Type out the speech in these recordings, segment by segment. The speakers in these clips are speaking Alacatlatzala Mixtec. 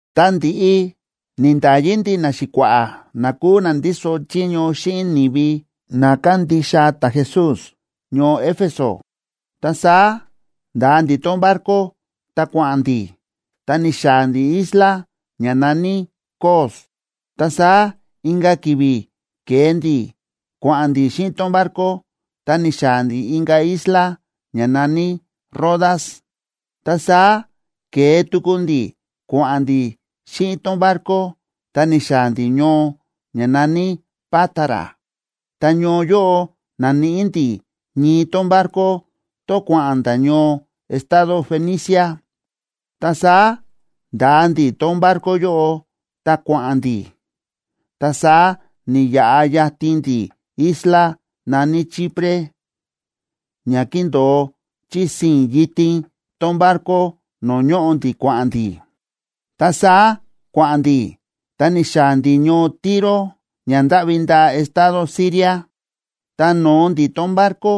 Ta ndi̱ꞌi ni̱nda̱yi ndi̱ naxi̱kua̱ꞌa̱ na kúu na ndíso chiño xíꞌin ni̱vi na kándixa ta̱Jesús ñoo Éfeso, ta saá nda̱a ndi̱ tón barco ta kua̱ꞌa̱n ndi̱, ta ni̱xaa̱ ndi̱ isla ña na̱ní Cos. Ta saá inka̱ ki̱vi̱ ke̱e ndi̱ kua̱ꞌa̱n ndi̱ xíꞌin tón barco ta ni̱xaa̱ ndi̱ inka̱ isla ña na̱ní Rodas. Ta saá ke̱e tuku ndi̱ kua̱ꞌa̱n ndi̱ xíꞌin tón barco ta ni̱xaa̱ ndi̱ ñoo ña na̱ní Pátara. Ta ñoo yóꞌo na̱níꞌi ndi̱ ñii tón barco, tón kua̱ꞌa̱n nda̱ ñoo estado Fenicia, ta saá nda̱a ndi̱ tón barco yóꞌo, ta kua̱ꞌa̱n ndi̱. Ta saá ni̱yaꞌa yatin ndi̱ isla na̱ní Chipre, ña kíndo̱o chí sii̱n yitin tón barco no̱o̱ ñóꞌo ndi̱ kua̱ꞌa̱n ndi̱. Ta saá kua̱ꞌa̱n ndi̱, ta ni̱xaa̱ ndi̱ ñoo Tiro ña ndáꞌvi ndaa estado Siria. Ta no̱o ndi̱ tón barco,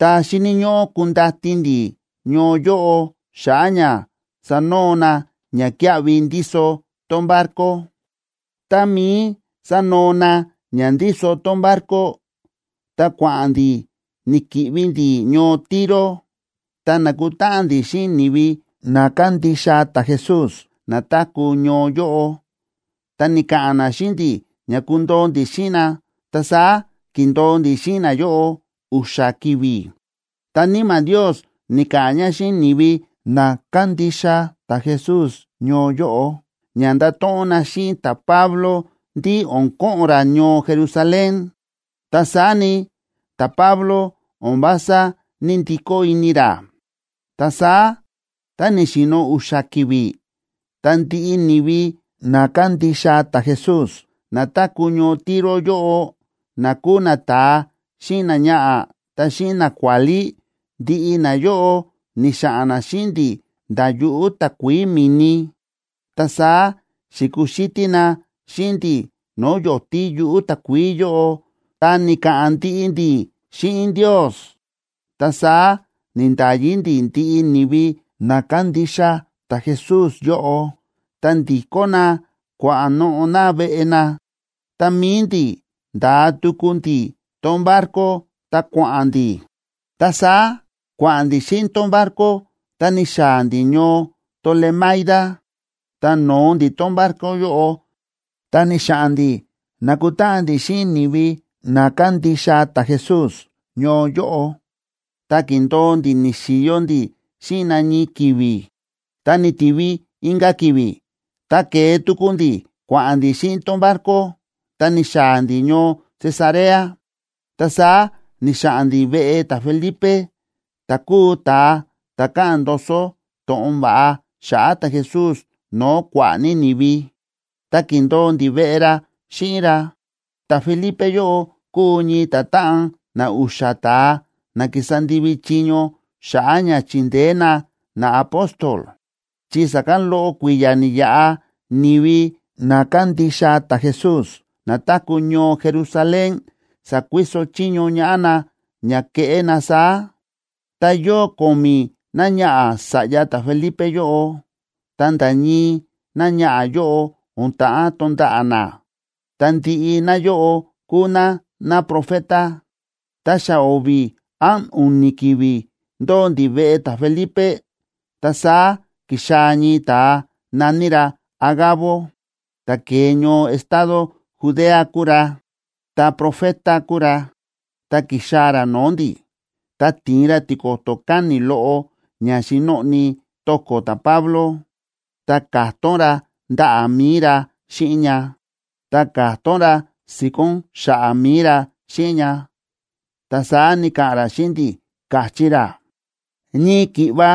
ta xíni̱ ñóꞌó kundati ndi̱ ñoo yóꞌo xa̱ꞌa̱ ña sanoo na ñakíaꞌvi ndíso tón barco. Tá mií sánoo na ña ndíso tón barco, ta kua̱ꞌa̱n ndi̱ ni̱ki̱ꞌvi ndi̱ ñoo Tiro, ta na̱kutáꞌan ndi̱ xíꞌin ni̱vi na kándixa ta̱Jesús na táku̱ ñoo yóꞌo. Ta ni̱ka̱ꞌa̱n na xíꞌin ndi̱ ña kundoo ndi̱ xíꞌin na, ta saá ki̱ndo̱o ndi̱ xíꞌin nayóꞌo u̱xa̱ ki̱vi̱. Ta Níma̱ Ndios ni̱ka̱ꞌa̱n ña xíꞌin ni̱vi na kándixa ta̱Jesús ñoo yóꞌo ña nda̱to̱ꞌon na xíꞌin ta̱Pablo ndí o̱n ko̱ꞌo̱n ra ñoo Jerusalén. Ta saá ni, ta̱Pablo o̱n vása ní‑ndikó ini ra. Ta saá tá ni̱xi̱no̱ u̱xa̱ ki̱vi̱, ta ndiꞌi ni̱vi na kándixa ta̱Jesús na táku̱ ñoo Tiro yóꞌo, na kúu nata̱a xíꞌin náñaꞌa̱, ta xíꞌin nakuálí, ndiꞌi nayóꞌo ni̱xa̱ꞌa̱n na xíꞌin ndi̱ nda̱ yuꞌu̱ takuií mi̱ni. Ta saá xi̱kuxítí na xíꞌin ndi̱ no̱o̱ yo̱tí yuꞌu̱ takuií yóꞌo, ta ni̱ka̱ꞌa̱n ndiꞌi ndi̱ xíꞌin Ndios. Ta saá ni̱nda̱yi ndi̱ ndiꞌi ni̱vi na kándixa ta̱Jesús yóꞌo, ta ndi̱kó na kua̱noꞌo̱ na veꞌe na. Ta mi̱i ndi̱ nda̱a tuku ndi̱ tón barco ta kua̱ꞌa̱n ndi̱. Ta saá kua̱ꞌa̱n ndi̱ xíꞌin tón barco ta ni̱xaa̱ ndi̱ ñoo Tolemaida. Ta no̱o ndi̱ tón barco yóꞌo, ta ni̱xa̱ꞌa̱n ndi̱ na̱kutáꞌan ndi̱ xíꞌin ni̱vi na kándixa ta̱Jesús ñoo yóꞌo, ta ki̱ndo̱o ndi̱ ni̱xi̱yo ndi̱ xíꞌin na ñii ki̱vi̱. Ta ni̱ti̱vi inka̱ ki̱vi̱, ta ke̱e tuku ndi̱ kua̱ꞌa̱n ndi̱ xíꞌin tón barco, ta ni̱xaa̱ ndi̱ ñoo Cesarea. Ta saá ni̱xa̱ꞌa̱n ndi̱ veꞌe ta̱Felipe, ta̱ kúu ta̱a ta̱ káꞌa̱n ndoso to̱ꞌon va̱ꞌa xa̱ꞌa̱ ta̱Jesús no̱o̱ kua̱ꞌa̱ ní ni̱vi, ta ki̱ndo̱o ndi̱ veꞌe ra xíꞌin ra. Ta̱Felipe yóꞌo kúu ñii ta̱táꞌan na u̱xa̱ ta̱a na kísa ndivi chiño xa̱ꞌa̱ ña chindeé na naapóstol, chi sa̱kán loꞌo kui̱ya̱ ni̱yaꞌa, ni̱vi na kándixa ta̱Jesús na táku̱ ñoo Jerusalén sa̱kuiso chiño ñaꞌá na ña keꞌé na saá. Ta yóo ko̱mi̱ náñaꞌa̱ sa̱ꞌya ta̱Felipe yóꞌo, ta nda̱ ñii náñaꞌa̱ yóꞌo o̱n ta̱ꞌán tonda̱ꞌa̱ ná, ta ndiꞌi náyóꞌo kúu ná náprofeta. Ta xa o̱vi̱ án u̱ni̱ ki̱vi̱ ndóo ndi̱ veꞌe ta̱Felipe, ta saá ki̱xaa̱ ñii ta̱a na̱ní ra Agabo, ta̱ ke̱e ñoo estado Judea kúu ra, ta̱profeta kúu ra. Tá ki̱xaa̱ ra no̱o̱ ndi̱, ta ti̱in ra tiko̱to̱ káni̱ loꞌo ña xi̱noꞌni to̱ko̱ ta̱Pablo, ta ka̱tón ra ndaꞌa̱ mi̱i ra xíꞌin ña, ta ka̱tón ra si̱ko̱n xa̱ꞌa̱ mi̱i ra xíꞌin ña. Ta saá ni̱ka̱ꞌa̱n ra xíꞌin ndi̱, káchí ra: ―Ñii ki̱ꞌva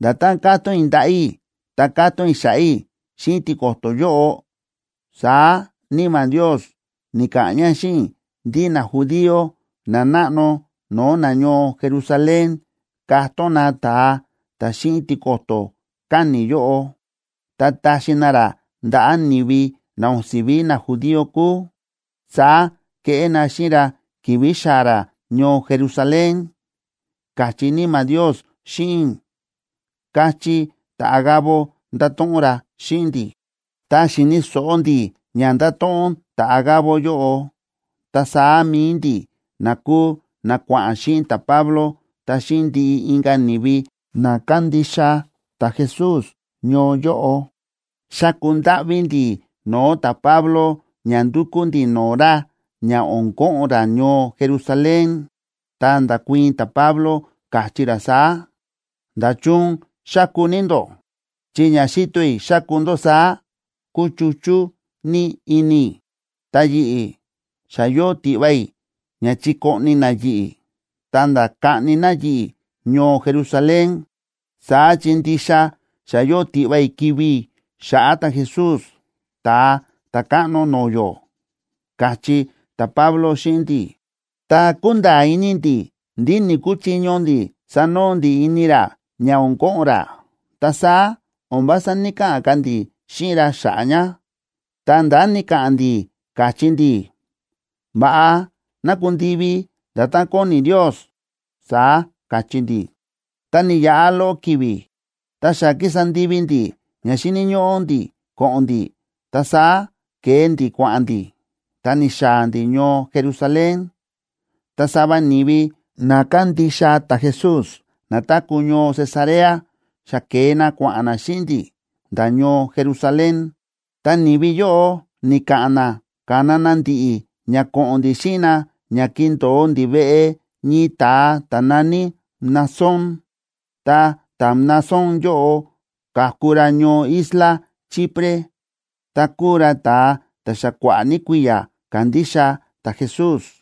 nda̱tán ka̱tón i̱ ndaꞌa̱ i̱ ta ka̱tón i̱ xa̱ꞌa̱ i̱ xíꞌin tiko̱to̱ yóꞌo, saá Níma̱ Ndios ni̱ka̱ꞌa̱n ña xíꞌin i̱ ndí najudío nanáꞌno no̱o̱ nañoo Jerusalén katón na ta̱a ta̱ xíꞌin tiko̱to̱ káni̱ yóꞌo, ta taxi na ra ndaꞌa̱ ni̱vi na o̱n si̱ví najudío kúu. Saá keꞌé na xíꞌin ra ki̱vi̱ xaa̱ ra ñoo Jerusalén, káchí Níma̱ Ndios xíꞌin i̱ ―káchí ta̱Agabo, nda̱to̱ꞌon ra xíꞌin ndi̱. Tá xi̱ni̱ so̱ꞌo ndi̱ ña nda̱to̱ꞌon ta̱Agabo yóꞌo, ta saá mi̱i ndi̱ na kúu na kua̱ꞌa̱n xíꞌin ta̱Pablo ta xíꞌin ndiꞌi inka̱ ni̱vi na kándixa ta̱Jesús ñoo yóꞌo, xa̱ku ndáꞌví ndi̱ no̱o̱ ta̱Pablo ña ndukú ndi̱ no̱o̱ ra ña o̱n ko̱ꞌo̱n ra ñoo Jerusalén. Ta nda̱kuii̱n ta̱Pablo, káchí ra saá: ―¿Nda̱chun xáku ní ndó?, chi ña xíto i̱ xáku ndó saá, kúchuchú ní ini i̱. Ta yi̱ꞌi̱, xa yóo tiꞌva i̱ ña chikoꞌni na yi̱ꞌi̱, ta̱nda̱ kaꞌni na yi̱ꞌi̱ ñoo Jerusalén, saá chi ndixa xa yóo tiꞌva i̱ kivi̱ i̱ xa̱ꞌa̱ ta̱Jesús, Ta̱a Ta̱káꞌno no̱o̱ yó ―káchí ta̱Pablo xíꞌin ndi̱. Tá kúnda̱a̱ ini ndi̱ ndí ni̱‑kuchiño ndi̱ sanoo ndi̱ ini ra ña o̱n ko̱ꞌo̱n ra, ta saá o̱n vása ní‑kaꞌa̱n ka̱ ndi̱ xíꞌin ra xa̱ꞌa̱ ña. Ta ndá ni̱ka̱ꞌa̱n ndi̱, káchí ndi̱: ―Va̱ꞌa ná kundivi nda̱tán kóni Ndios ―saá káchí ndi̱. Ta ni̱yaꞌa loꞌo ki̱vi̱, tá xa ki̱sa ndivi ndi̱ ña xíni̱ ñóꞌó ndi̱ ko̱ꞌo̱n ndi̱, ta saá ke̱e ndi̱ kua̱ꞌa̱n ndi̱, ta ni̱xaa̱ ndi̱ ñoo Jerusalén. Ta sava ni̱vi na kándixa ta̱Jesús na táku̱ ñoo Cesarea xa ke̱e na kua̱ꞌa̱n na xíꞌin ndi̱ nda̱ ñoo Jerusalén. Ta ni̱vi yóꞌo ni̱ka̱ꞌa̱n na ka̱na na ndi̱ꞌi̱ ña ko̱ꞌo̱n ndi̱ xíꞌin na ña kindo̱o ndi̱ veꞌe ñii ta̱a ta̱ na̱ní Mnasón. Ta ta̱Mnasón yóꞌo ka̱ku ra ñoo isla Chipre, ta kúu ra ta̱a ta̱ xa kua̱ꞌa̱ ní kui̱ya̱ kándixa ta̱Jesús.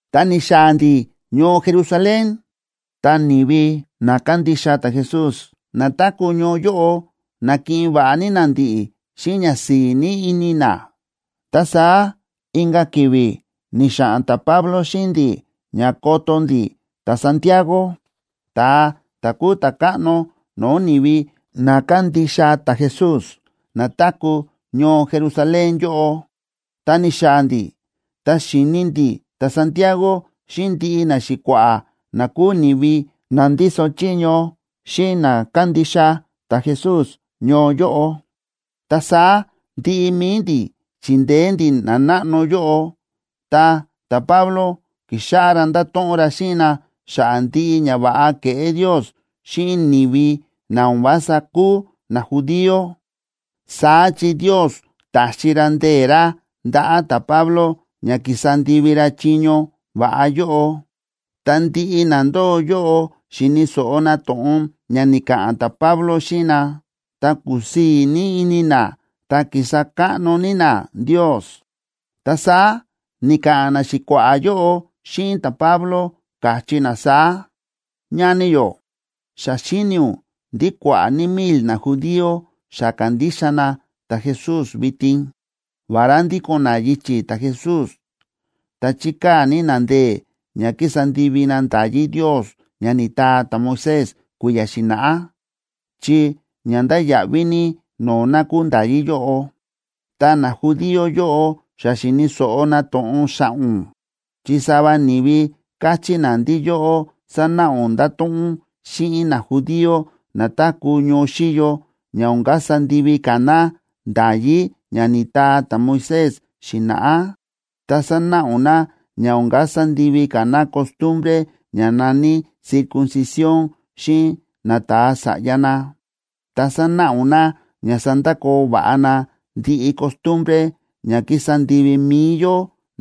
Tá ni̱xaa̱ ndi̱ ñoo Jerusalén, ta ni̱vi na kándixa ta̱Jesús na táku̱ ñoo yóꞌo na̱kiꞌin va̱ꞌa ní na ndi̱ꞌi̱ xíꞌin ñasi̱i̱ ní ini na. Ta saá inka̱ ki̱vi̱ ni̱xa̱ꞌa̱n ta̱Pablo xíꞌin ndi̱ ña koto ndi̱ ta̱Santiago,a ta̱a ta̱ kúu ta̱káꞌno no̱o̱ ni̱vi na kándixa ta̱Jesús na táku̱ ñoo Jerusalén yóꞌo. Ta ni̱xaa̱ ndi̱ ta xi̱ni ndi̱ ta̱Santiago xíꞌin ndiꞌi naxi̱kua̱ꞌa̱ na kúu ni̱vi na ndíso chiño xíꞌin na kándixa ta̱Jesús ñoo yóꞌo. Ta saá ndiꞌi mi̱i ndi̱ chi̱ndeé ndi̱ nanáꞌno yóꞌo, ta ta̱Pablo ki̱xáꞌá ra ndáto̱ꞌon ra xíꞌin na xa̱ꞌa̱ ndiꞌi ñava̱ꞌa ke̱ꞌé Ndios xíꞌin ni̱vi na o̱n vása kúu najudío, saá chi Ndios ta̱xi ra ndee̱ ra ndaꞌa̱ ta̱Pablo ña kísa ndivi ra chiño va̱ꞌa yóꞌo. Tá ndiꞌi na ndóo yóꞌo xi̱ni̱ so̱ꞌo na to̱ꞌon ña ni̱ka̱ꞌa̱n ta̱Pablo xíꞌin na, ta kúsii̱ ní ini na, ta ki̱sa káꞌno ní na Ndios. Ta saá ni̱ka̱ꞌa̱n naxi̱kua̱ꞌa̱ yóꞌo xíꞌin ta̱Pablo, káchí na saá: ―Ñani yó, xa xíni ún ndí kua̱ꞌa̱ ní mil najudío xa ka̱ndixa na ta̱Jesús vitin. Vará ndíko̱n na yichi̱ ta̱Jesús, ta chíkaa̱ ní na ndee̱ ña kísa ndivi na nda̱yí Ndios ña ni̱taa ta̱Moisés kui̱ya̱ xi̱na̱ꞌá, chi ña ndáya̱ꞌví ní no̱o̱ na kúu nda̱yí yóꞌo. Ta najudío yóꞌo xa xi̱ni̱ so̱ꞌo na to̱ꞌon xa̱ꞌa̱ ún, chi sava ni̱vi káchí na ndí yóꞌó sánáꞌa ún ndáto̱ꞌon ún xíꞌin najudío na táku̱ ñoo xíyo ña o̱n kasa ndivi ka̱ na nda̱yí ña ni̱taa ta̱Moisés xi̱na̱ꞌá, ta sánáꞌa ún na ña o̱n kasa ndivi ka̱ na costumbre ña na̱ní circuncisión xíꞌin nata̱a sa̱ꞌya na, ta sánáꞌa ún na ña sandakoo va̱ꞌa na ndiꞌi costumbre ña kísa ndivi mi̱i yó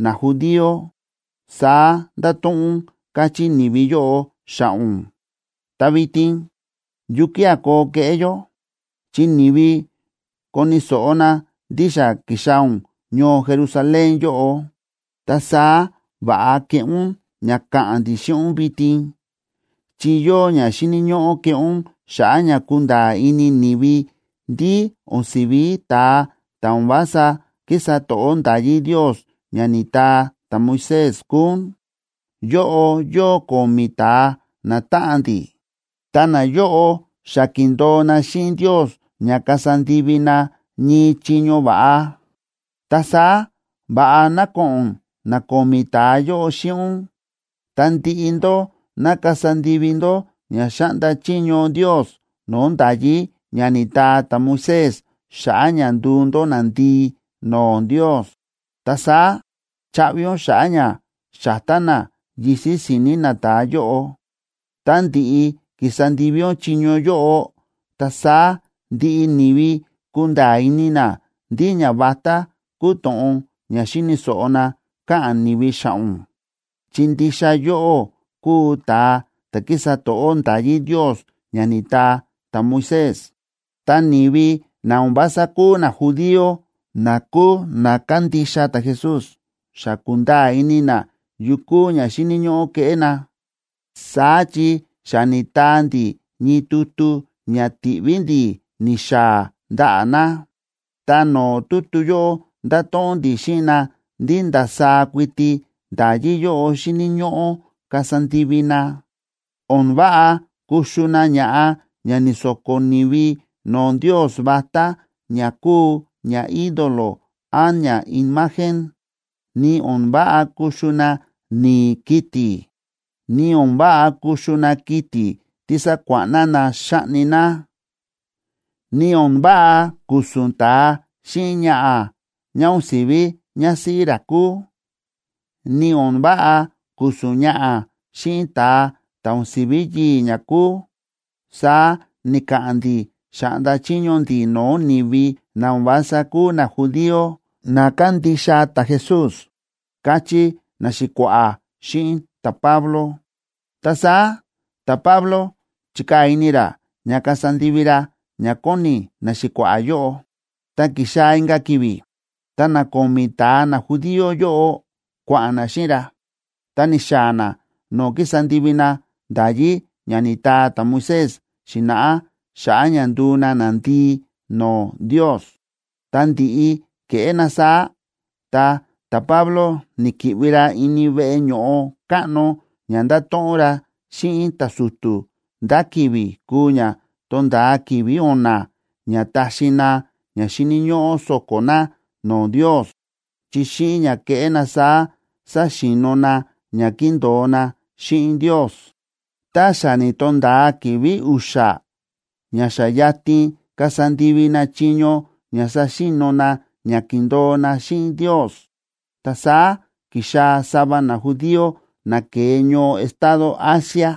najudío, saá ndáto̱ꞌon ún, káchí ni̱vi yóꞌo xa̱ꞌa̱ ún. Ta vitin, ¿yukía̱ koo keꞌé yó?, chi ni̱vi koni̱ so̱ꞌo na ndí xa ki̱xaa̱ ún ñoo Jerusalén yóꞌo. Ta saá va̱ꞌa keꞌé ún ña káꞌa̱n ndi̱ xíꞌin ún vitin, chi yóo ña xíni̱ ñóꞌó keꞌé ún xa̱ꞌa̱ ña kunda̱a̱ ini ni̱vi ndí o̱n si̱ví ta̱a ta̱ o̱n vása kísa to̱ꞌó nda̱yí Ndios ña ni̱taa ta̱Moisés kúu ún. Yóꞌo yóo ko̱mi̱ ta̱a natáꞌan ndi̱, ta nayóꞌo xa ki̱ndo̱o na xíꞌin Ndios ña kasa ndivi na ñii chiño va̱ꞌa. Ta saá va̱ꞌa ná ko̱ꞌo̱n na ko̱mi̱ ta̱a yóꞌo xíꞌin ún, ta ndiꞌi ndó ná kasa ndivi ndó ña xáꞌnda chiño Ndios no̱o̱ nda̱yí ña ni̱taa ta̱Moisés xa̱ꞌa̱ ña nduu ndó nandii no̱o̱ Ndios. Ta saá chaꞌvi ún xa̱ꞌa̱ ña xa̱tá na yisi̱ si̱ni̱ nata̱a yóꞌo. Tá ndi̱ꞌi ki̱sa ndivi ún chiño yóꞌo, ta saá ndiꞌi ni̱vi kunda̱a̱ ini na ndí ñavatá kúu to̱ꞌon ña xi̱ni̱ so̱ꞌo na káꞌa̱n ni̱vi xa̱ꞌa̱ ún, chi ndixa yóꞌó kúu ta̱a ta̱ kísa to̱ꞌó nda̱yí Ndios ña ni̱taa ta̱Moisés. Ta ni̱vi na o̱n vása kúu najudío, na kúu na kándixa ta̱Jesús, xa kúnda̱a̱ ini na yu kúu ña xíni̱ ñóꞌó keꞌé na, saá chi xa ni̱taa ndi̱ ñii tutu ña ti̱ꞌví ndi̱ ni̱xaa̱ ndaꞌa̱ na. Ta no̱o̱ tutu yóꞌo nda̱to̱ꞌon ndi̱ xíꞌin na ndí ndasaá kuiti nda̱yí yóꞌo xíni̱ ñóꞌó kasa ndivi na: “O̱n váꞌa kuxu na ña̱ꞌa ña ni̱so̱ko̱ ni̱vi no̱o̱ ndios vatá ña kúu ñaídolo án ñaimagen, ni o̱n váꞌa kuxu na ni̱i̱ kiti̱, ni o̱n váꞌa kuxu na kiti̱ tí sa̱kuáꞌna na xa̱ꞌni na, ni o̱n váꞌa ku̱su̱n ta̱a xíꞌin ñaꞌa̱ ñá o̱n si̱ví ñásíꞌí ra kúu, ni o̱n váꞌa ku̱su̱n ñaꞌa̱ xíꞌin ta̱a ta̱ o̱n si̱ví yii̱ ñá kúu”, saá ni̱ka̱ꞌa̱n ndi̱, xa̱ꞌnda chiño ndi̱ no̱o̱ ni̱vi na o̱n vása kúu najudío, na kándixa ta̱Jesús ―káchí naxi̱kua̱ꞌa̱ xíꞌin ta̱Pablo. Ta saá ta̱Pablo chi̱kaa̱ ini ra ña kasa ndivi ra ña kóni naxi̱kua̱ꞌa̱ yóꞌo. Tá ki̱xaa̱ inka̱ ki̱vi̱, ta na ko̱mi̱ ta̱a najudío yóꞌo kua̱ꞌa̱n na xíꞌin ra, ta ni̱xaa̱ na no̱o̱ ki̱sa ndivi na nda̱yí ña ni̱taa ta̱Moisés xi̱na̱ꞌá xa̱ꞌa̱ ña nduu na nandii no̱o̱ Ndios. Ta ndi̱ꞌi ke̱ꞌé na saá, ta ta̱Pablo ni̱ki̱ꞌvi ra ini veꞌe ño̱ꞌo káꞌno ña ndato̱ꞌon ra xíꞌin ta̱su̱tu̱ ndá ki̱vi̱ kuu ña tonda̱a ki̱vi̱ o̱na̱ ña taxi na ña xíni̱ ñóꞌó so̱ko̱ na no̱o̱ Ndios, chi xíꞌin ña keꞌé na saá saxi̱no̱ na ña ki̱ndo̱o na xíꞌin Ndios. Tá xa ni̱to̱nda̱a ki̱vi̱ u̱xa̱ ña xa yatin kasa ndivi na chiño ña saxi̱no̱ na ña ki̱ndo̱o na xíꞌin Ndios, ta saá ki̱xaa̱ sava najudío na ke̱e ñoo estado Asia,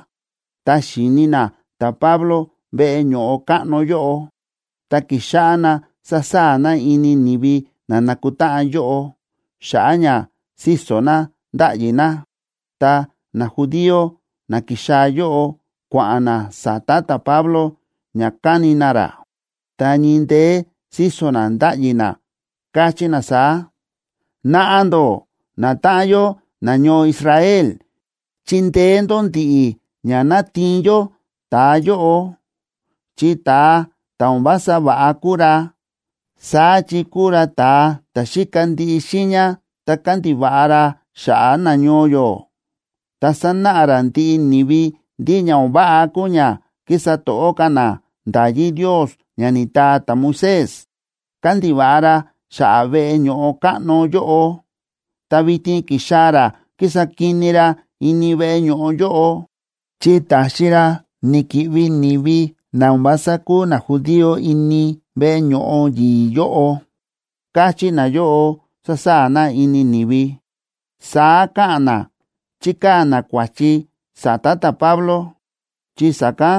ta xi̱ni na ta̱Pablo veꞌe ño̱ꞌo káꞌno yóꞌo. Ta ki̱xáꞌá na sa̱saa̱ na ini ni̱vi na nákutáꞌan yóꞌo, xa̱ꞌa̱ ña síso̱ na, ndáꞌyi na. Ta najudío na ki̱xaa̱ yóꞌo kua̱ꞌa̱n na sa̱ta̱ ta̱Pablo ña kani na ra. Ta ñii ndeé síso̱ na ndáꞌyi na, káchí na saá: ―Naꞌa ndó, natáꞌan yó nañoo Israel, chindeé ndó ndi̱ꞌi̱ ña ná tiin yó ta̱a yóꞌo, chi ta̱a ta̱ o̱n vása va̱ꞌa kúu ra. Saá chi kúu ra ta̱a ta̱ xíka ndiꞌi xiiña ta kándiva̱ꞌa ra xa̱ꞌa̱ nañoo yó, ta sánáꞌa ra ndiꞌi ni̱vi ndí ña o̱n váꞌa kúu ña kísa to̱ꞌó ka̱ na nda̱yí Ndios ña ni̱taa ta̱Moisés. Kándiva̱ꞌa ra xa̱ꞌa̱ veꞌe ño̱ꞌo káꞌno yóꞌo, ta vitin ki̱xaa̱ ra kísa kini ra ini veꞌe ño̱ꞌo yóꞌo, chi ta̱xi ra ni̱ki̱ꞌvi ni̱vi na o̱n vása kúu najudío ini veꞌe ño̱ꞌo yi̱i̱ yóꞌo ―káchí nayóꞌo, sásaa̱ na ini ni̱vi. Saá káꞌa̱n na chíkaa̱ na kua̱chi sa̱ta̱ ta̱Pablo, chi sa̱kán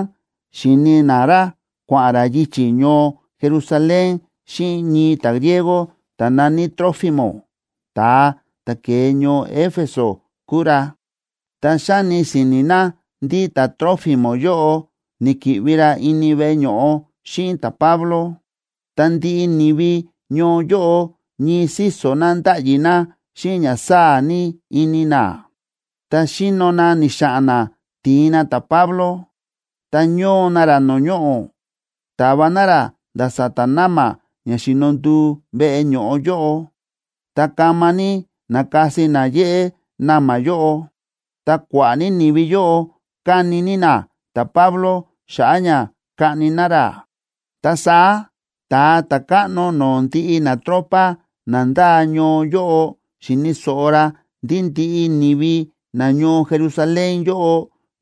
xi̱ni na ra kua̱ꞌa̱n ra yichi̱ ñoo Jerusalén xíꞌin ñii ta̱griego ta̱ na̱ní Trófimo, ta̱a ta̱ ke̱e ñoo Éfeso kúu ra. Ta xáni si̱ni̱ na ndí ta̱Trófimo yóꞌo ni̱ki̱ꞌvi ra ini veꞌe ño̱ꞌo xíꞌin ta̱Pablo. Ta ndiꞌi ni̱vi ñoo yóꞌo ñii síso̱ na ndáꞌyi na xíꞌin ña sáa̱ ní ini na. Ta xíno na ni̱xa̱ꞌa̱n na ti̱in na ta̱Pablo, ta ñóo na ra no̱o̱ ñoꞌo̱, ta̱va na ra nda̱ sa̱ta̱ na̱ma̱ ña xi̱no nduu veꞌe ño̱ꞌo yóꞌo, ta kama ní na̱kasi na yéꞌé na̱ma̱ yóꞌo. Ta kua̱ꞌa̱ ní ni̱vi yóꞌo káni ní na ta̱Pablo xa̱ꞌa̱ ña kaꞌni na ra. Ta saá ta̱a ta̱káꞌno no̱o̱ ndiꞌi natropa na ndáa ñoo yóꞌo xi̱ni̱ so̱ꞌo ra ndí ndiꞌi ni̱vi nañoo Jerusalén yóꞌo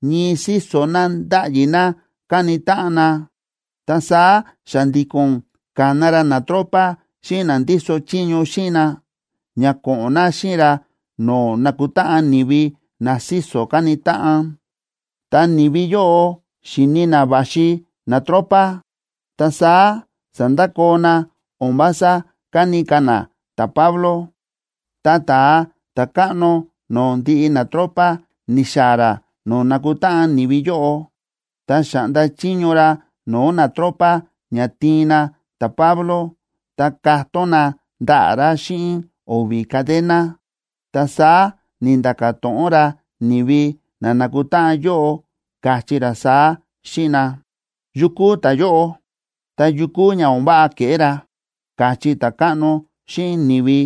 ñii síso̱ na ndáꞌyi na káni táꞌan na. Ta saá xa̱ndi̱ko̱n ka̱na ra natropa xíꞌin na ndíso chiño xíꞌin na, ña ko̱ꞌo̱n na xíꞌin ra no̱o̱ nákutáꞌan ni̱vi na síso̱ káni táꞌan. Ta ni̱vi yóꞌo xi̱ni na va̱xi natropa, ta saá sa̱ndakoo na, o̱n vása káni ka̱ na ta̱Pablo. Ta ta̱a ta̱káꞌno no̱o̱ ndiꞌi natropa ni̱xaa̱ ra no̱o̱ na̱kutáꞌan ni̱vi yóꞌo, ta xa̱ꞌnda chiño ra no̱o̱ natropa ña tiin na ta̱Pablo ta katón na ndaꞌa̱ ra xíꞌin o̱vi̱ cadena. Ta saá ni̱nda̱ka̱ to̱ꞌon ra ni̱vi na na̱kutáꞌan yóꞌo, káchí ra saá xíꞌin na: ―¿Yu kúu ta̱yóꞌo?, ta, ¿yu kúu ña o̱n váꞌa ke̱ꞌé ra? ―káchí ta̱káꞌno xíꞌin ni̱vi.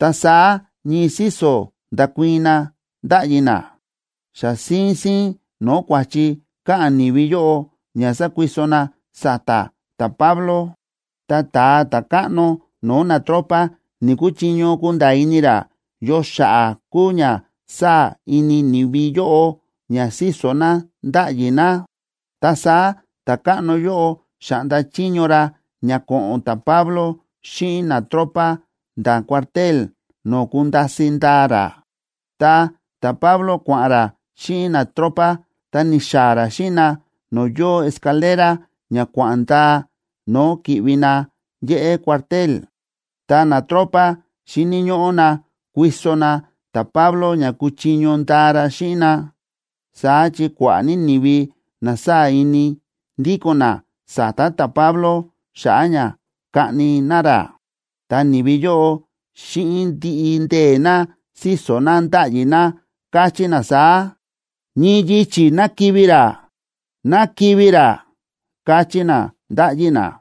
Ta saá ñii síso̱ nda̱kuii̱n na ndáꞌyi na, xa síín síín no̱o̱ kua̱chi káꞌa̱n ni̱vi yóꞌo ña sákuiso na sa̱ta̱ ta̱Pablo. Ta ta̱a ta̱káꞌno no̱o̱ natropa ni̱‑kuchiño kunda̱a̱ ini ra yo xa̱ꞌa̱ kúu ña sáa̱ ini ni̱vi yóꞌo ña síso̱ na ndáꞌyi na. Ta saá ta̱káꞌno yóꞌo xa̱ꞌnda chiño ra ña ko̱ꞌo̱n ta̱Pablo xíꞌin natropa nda̱ cuartel no̱o̱ kunda̱si̱ ndaa ra. Ta ta̱Pablo kua̱ꞌa̱n ra xíꞌin natropa ta ni̱xaa̱ ra xíꞌin na no̱o̱ yóo escalera ña kua̱ꞌa̱n ndaa no̱o̱ ki̱ꞌvi na yéꞌé cuartel. Ta natropa xíni̱ ñóꞌó na kuiso na ta̱Pablo ña kuchiño ndaa ra xíꞌin na, saá chi kua̱ꞌa̱ ní ni̱vi na sáa̱ ini, ndíko̱n na sa̱ta̱ ta̱Pablo xa̱ꞌa̱ ña kaꞌni na ra. Ta ni̱vi yóꞌo xíꞌin ndiꞌi ndee̱ na síso̱ na, ndáꞌyi na, káchí na saá: ―¡Ñii yichi̱ ná kivi̱ ra! ¡Ná kivi̱ ra! ―káchí na, ndáꞌyi na.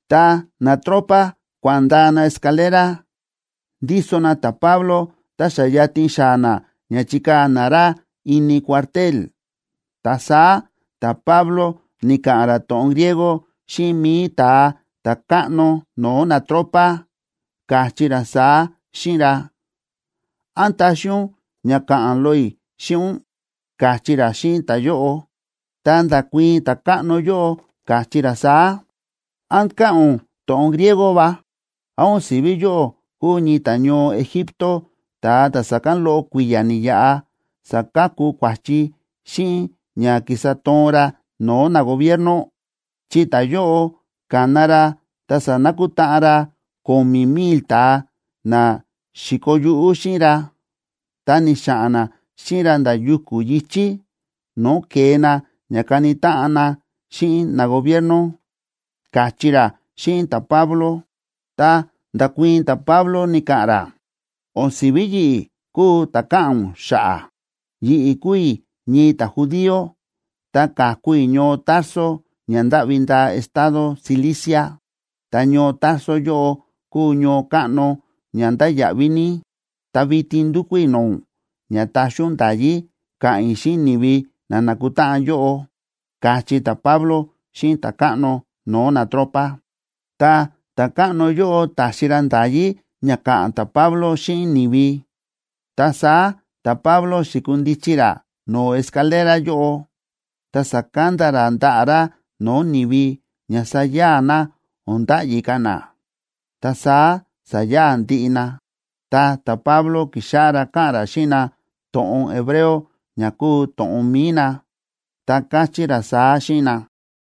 Ta natropa kua̱ꞌa̱n ndaa na escalera, ndíso na ta̱Pablo, ta xa yatin xaa̱ na ña chikaa̱ na ra ini cuartel, ta saá ta̱Pablo ni̱ka̱ꞌa̱n ra to̱ꞌon griego xíꞌin mi̱i ta̱a ta̱káꞌno no̱o̱ natropa, káchí ra saá xíꞌin ra: ―¿Án taxi ún ña ka̱ꞌa̱n loꞌo i̱ xíꞌin ún? ―káchí ra xíꞌin ta̱yóꞌo. Ta nda̱kuii̱n ta̱káꞌno yóꞌo, káchí ra saá: ―¿Án káꞌa̱n ún to̱ꞌon griego va? ¿Án o̱n si̱ví yóꞌó kúu ñii ta̱ñoo Egipto, ta̱a ta̱ sa̱kán loꞌo kui̱ya̱ ni̱yaꞌa sa̱kaku kua̱chi xíꞌin ña kísa toon ra no̱o̱ nagobierno? Chi ta̱yóꞌo ka̱na ra ta sa̱nakutáꞌan ra ko̱mi̱ mil ta̱a na xi̱koo yuꞌú xíꞌin ra, ta ni̱xa̱ꞌa̱n na xíꞌin ra nda̱ yuku̱ yi̱chí, no̱o̱ ke̱e na ña kani táꞌan na xíꞌin nagobierno ―káchí ra xíꞌin ta̱Pablo. Ta nda̱kuii̱n ta̱Pablo ni̱ka̱ꞌa̱n ra: ―O̱n si̱ví yi̱ꞌi̱ kúu ta̱ káꞌa̱n ún xa̱ꞌa̱. Yi̱ꞌi̱ kúu i̱ ñii ta̱judío, ta ka̱ku i̱ ñoo Tarso ña ndáꞌvi ndaa estado Cilicia, ta ñoo Tarso yóꞌo kúu ñoo káꞌno ña ndáya̱ꞌví ní. Ta vitin ndúkú i̱ no̱o̱ ún ña taxi ún nda̱yí ka̱ꞌa̱n i̱ xíꞌin ni̱vi na nákutáꞌan yóꞌo ―káchí ta̱Pablo xíꞌin ta̱káꞌno no̱o̱ natropa. Ta ta̱káꞌno yóꞌo ta̱xi ra nda̱yí ña ka̱ꞌa̱n ta̱Pablo xíꞌin ni̱vi. Ta saá ta̱Pablo xi̱kundichi ra no̱o̱ escalera yóꞌo, ta sa̱kanda ra ndaꞌa̱ ra no̱o̱ ni̱vi ña saya̱a̱ na, o̱n nda̱ꞌyi ka̱ na. Ta saá sa̱ya̱a̱ ndiꞌi na, ta ta̱Pablo ki̱xáꞌá ra káꞌa̱n ra xíꞌin na to̱ꞌon hebreo ña kúu to̱ꞌon mi̱i na, ta káchí ra saá xíꞌin na: